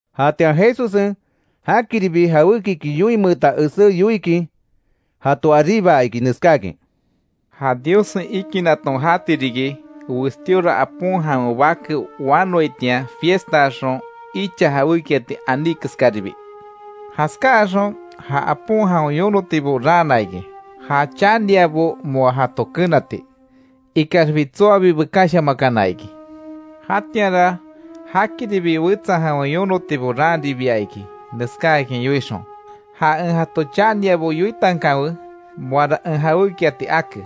Jatian Jesussen, jakiribi jawékiki yoinmeeta esé yoikin jato aríbaa iki neskáakin: “Ja Diossen ikinaton jati riki, westíora apon jawen bake wanoaitian fiestaaxon icha jawékiati aní keskaribi. Jaskáaxon, ja apon jawen yonotibo raana iki, ja chaniabo moa jato kenati, ikaxbi tsoabi bekashamakana iki. Jatianra jakiribi wetsa jawen yonotibo raanribia iki neskáakin yoixon: ‘Ja en jato chaniabo yoitankanwe moara en jawékiati ake.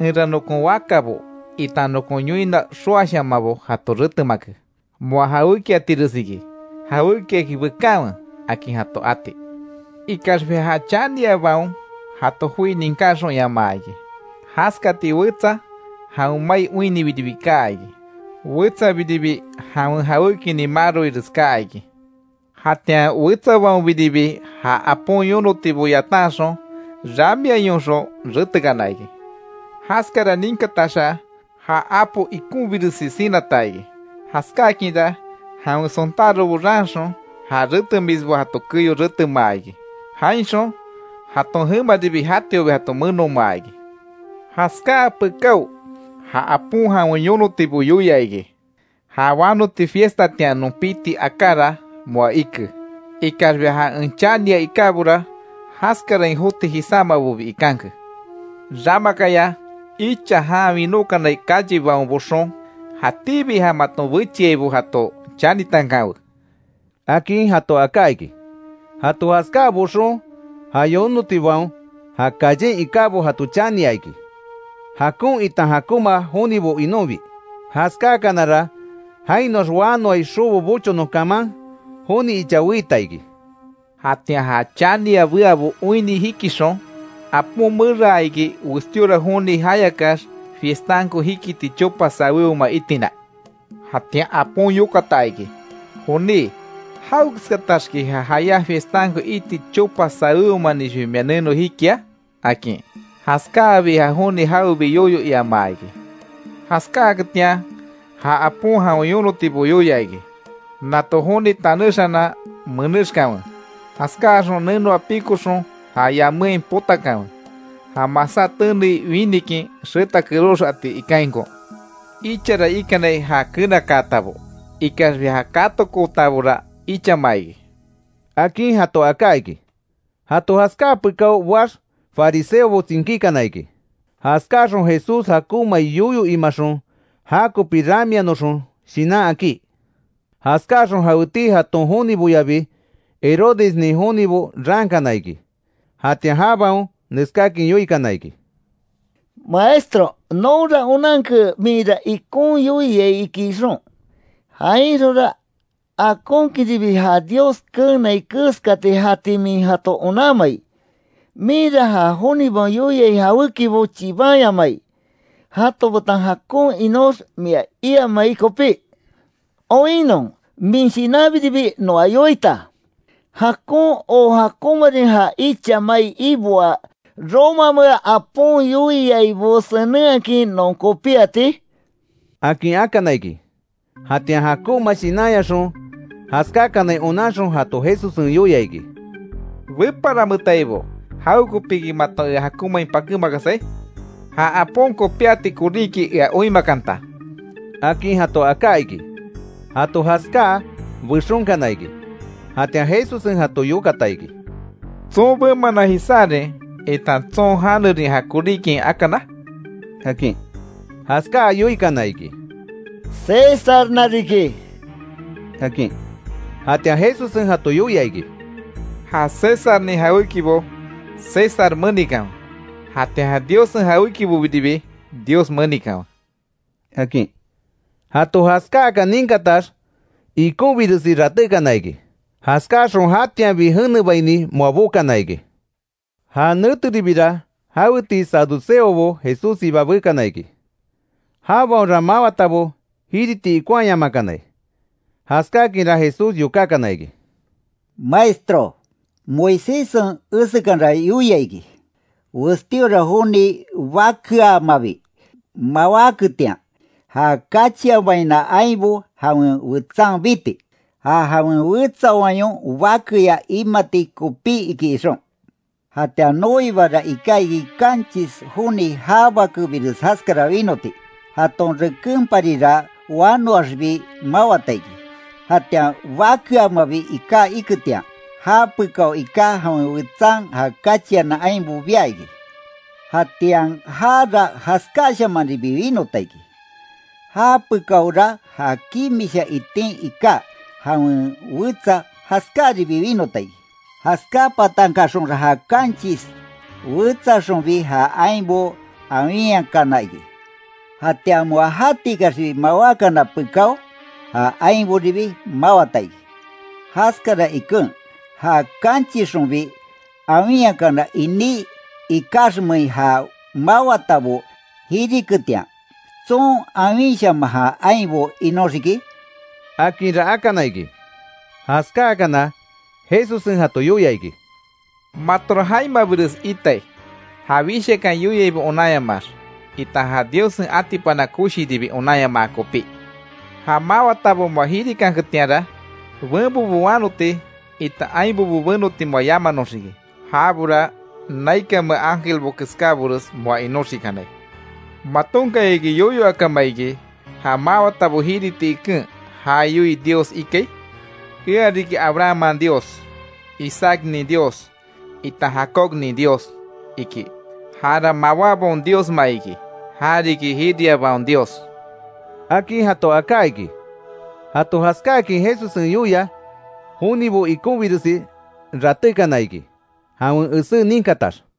Enra nokon wakabo itan nokon yoina xoashamanbo jato retemake, moa jawékiatiresiki. Jawékiaki bekanwe’, akin jato ati. Ikaxbi ja chaniabaon jato joi ninkáxonyamaa iki. Jaskati wetsa jawen mai oinnibiribi kaa iki. Wetsabiribi jawen jawékinin maroires kaa iki. Jatian wetsabaonbiribi ja apon yonotibo yatanxon, ramiayonxon retekana iki. Jaskara ninkataxa ja apo ikonbiresi sinata iki. Jaskákinra jawen sontárobo raanxon ja retemisbo jato keyo retemaa iki. Jainxon, jaton jemaribi jatiobi jato menomaa iki. Jaskáa pekáo ja apon jawen yonotibo yoia iki: ‘Ja wanoti fiestatian non piti akára moa ike, ikaxbi ja en chania ikábora jaskarain joti jisámabobi ikanke. Ramakaya icha jan winókanai callebaon boxon, jatíbi ja maton bechiaibo jato chanitankanwe’, akin jato aká iki. Jato jaskáa boxon ja yonotibaon ja callen ikábo jato chania iki, jakon itan jakonma jonibo inonbi, jaskáakanara jainoax wanoai xobo bochonon kaman joni icha weita iki. Jatian ja chania beabo oinni jikixon apon meraa iki westíora joni jayakax fiestanko jikiti chopa sawéoma itina. Jatian apon yokata iki: ‘Joní ¿Jawekeskataxki ja jayá fiestanko iti chopa sawéomanixbi mia neno jikia?’ akin. Jaskáabi ja joni jawebi yoyo iama iki. Jaskaketian ja apon jawen yonotibo yoia iki: ‘Nato joni tanéxanan menéxkanwe, jaskáaxon nenoa pikoxon ja yaméain potakanwe, ja masá tenei winikin xeta kerox ati ikainko’. Ichara ikanai ja kenakaatabo ikaxbi ja katokootabora ichama iki”, akin jato aká iki. Jato jaskáa pekáo boax fariseobo tsinkíkana iki, jaskáaxon Jesús jakonmai yoyo imaxon jakopi ramianoxon shinan akí. Jaskáaxon jaweti jaton joniboyabi Herodesnin jonibo raankana iki, jatian jabaon neskáakin yoikana iki: —¡Maestro! Nonra onanke minra ikon yoiai iki ixon, jainxonra akonkinribi ja Dios keenai keskati jati min jato onanmai. Minra ja jonibaon yoiai jawékibo chibanyamai, jato betan jakon inox mia iamai kopí. Oinnon min shinanbiribi noa yoita. ¿Jakon o jakonmarin ja icha mai iboaa romamea apon yoiaibo senenhakin non kopíati? —akin akana iki. Jatian jakonma shinanyaxon jaskáakanai onanxon jato Jesussen yoia iki: —¡Beparanmetaibo! ¿Jawekopiki maton ea jakonmain pakémakasai? Jan apo kopíati koríki ea oinmakanta —akin jato aká iki. Jato jaskáa, bexonkana iki. Jatian Jesussen jato yokata iki: —¿Tson bemanan jisárin itan tson janerin ja koríkiain akana? —akin. Jaskáa yoikana iki: —Césarna riki —akin. Jatian Jesussen jato yoia iki: —Ja Césarnin jawékibo, César menikanwe. Jatian ja Diossen jawékibobiribi Dios menikanwe —akin. Jato jaskáaka ninkatax ikonbiresi ratékana iki, jaskaxon jatianbi jenebaini moa bokana iki. Ja neteribira jaweti saduceobo Jesússiba bekana iki, jabaonra mawatabo jiriti ikonhaayamakanai, jaskakinra Jesús yokákana iki: —Maestro, Moiséssen esekanra yoia iki, westíora joni bakeaamabi mawáketian, ja kachianbaina ainbo jawen wetsan biti, ja jawen wetsa wayon bakeya imati kopí iki ixon. Jatian noibara iká iki kanchis joni ja bakebires jaskara winoti, jaton rekenparira wanoaxbi mawata iki, jatian bakeamabi iká iketian, já pekao iká jawen wetsan ja kachiana ainbo bia iki. Jatian jara jaskashamanribi winota iki, japekaora ja kimisha itin iká jawen wetsa jaskáribi winota iki, jaskápatankaxonra ja kanchis wetsaxonbi ja ainbo awinhakana iki. Jatian moa jatikaxbi mawákana pekáo, ja ainboribi mawata iki. Jaskara iken ja kanchisxonbi awinhakana iní ikaxmein ja mawatabo jiriketian ¿Tson awinshaman ja ainbo inoxiki? —akinra akana iki. Jaskáakana Jesussen jato yoia iki: —Matora jaimabires itai, ja wishakan yoiaibo onanyamaax, itan ja Diossen atipana koshiribi onanyamaa kopí. Ja mawatabo moa jirikanketianra, benbobo wanoti itan ainbobo benoti moa yamanoxiki. Jabora naikanmea ángelbo keskábores moa inoxikanai. ¿Matonkayaki yoyo akama iki, ja mawatabo jiriti iken ja yoii Dios ikai ‘Ea riki Abrahamman Dios, Isaacnin Dios, itan Jacobnin Dios?’ iki. Jara mawábaon Diosma iki, ja riki jiriabaon Dios —akin jato aká iki. Jato jaskáakin Jesussen yoia, jonibo ikonbiresi ratékana iki jawen esé ninkatax.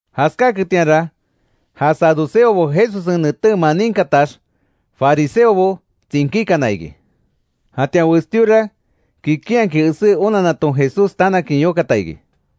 Jaskáketianra, ja saduceobo Jesussen netémaa ninkatax, fariseobo tsinkíkana iki. Jatian westíora kikinhakin esé onannaton Jesús tanakin yokata iki: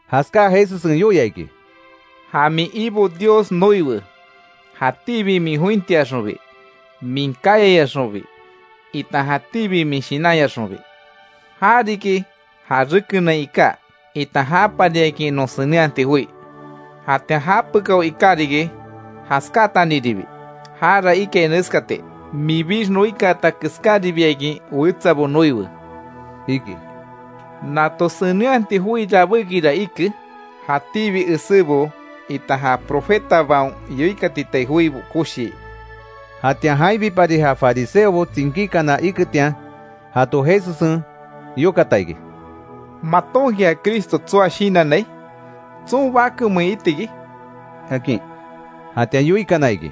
Jaskáa Jesussen yoia iki: —‘Ja min Ibo Dios noiwe, jatíbi min jointiaxonbi, min kayayaxonbi itan jatíbi min shinanyaxonbi’. Jariki ja rekenain iká itan japariakin non senenhati joi. Jatian japekao iká riki, jaskataniribi; jara ikai neskati: ‘Minbix noikaata keskáribiakin wetsabo noiwe’, iki. Nato senenhati joi rabékira ike jatíbi esébo itan ja profetabaon yoikatitai joibo koshii. Jatian jainbipari ja fariseobo tsinkíkana iketian jato Jesussen yokata iki: ¿Matonki ja Cristo tsoa shinannai? ¿Tson bakemein itiki? —akin. Jatian yoikana iki: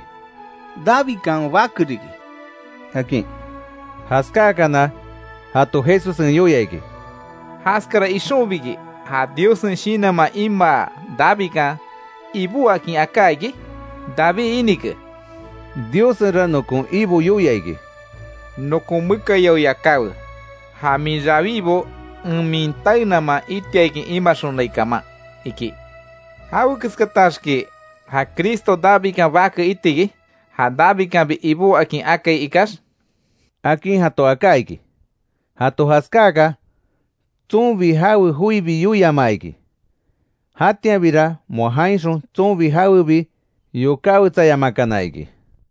—Davidkan bake riki —akin. Jaskáakana jato Jesussen yoia iki: —¿Jaskara ixonbiki ja Diossen Shinanman imaa Davidkan, Ibó akin aká iki? David inike: Diossenra nokon Ibo yoia iki: ‘Nokon mekayao yakáwe, Ja min rawibo en min taenaman itiakin imaxonai kaman iki’. ¿Jawekeskataxki ja Cristo Davidkan bake itiki, ja Davidkanbi Ibó akin akai ikax? —akin jato aká iki. Jato jaskáaka tsonbi jawe joibi yoiamaa iki. Jatianbira moa jainxon tsonbi jawebi yokáwetsayamakana iki.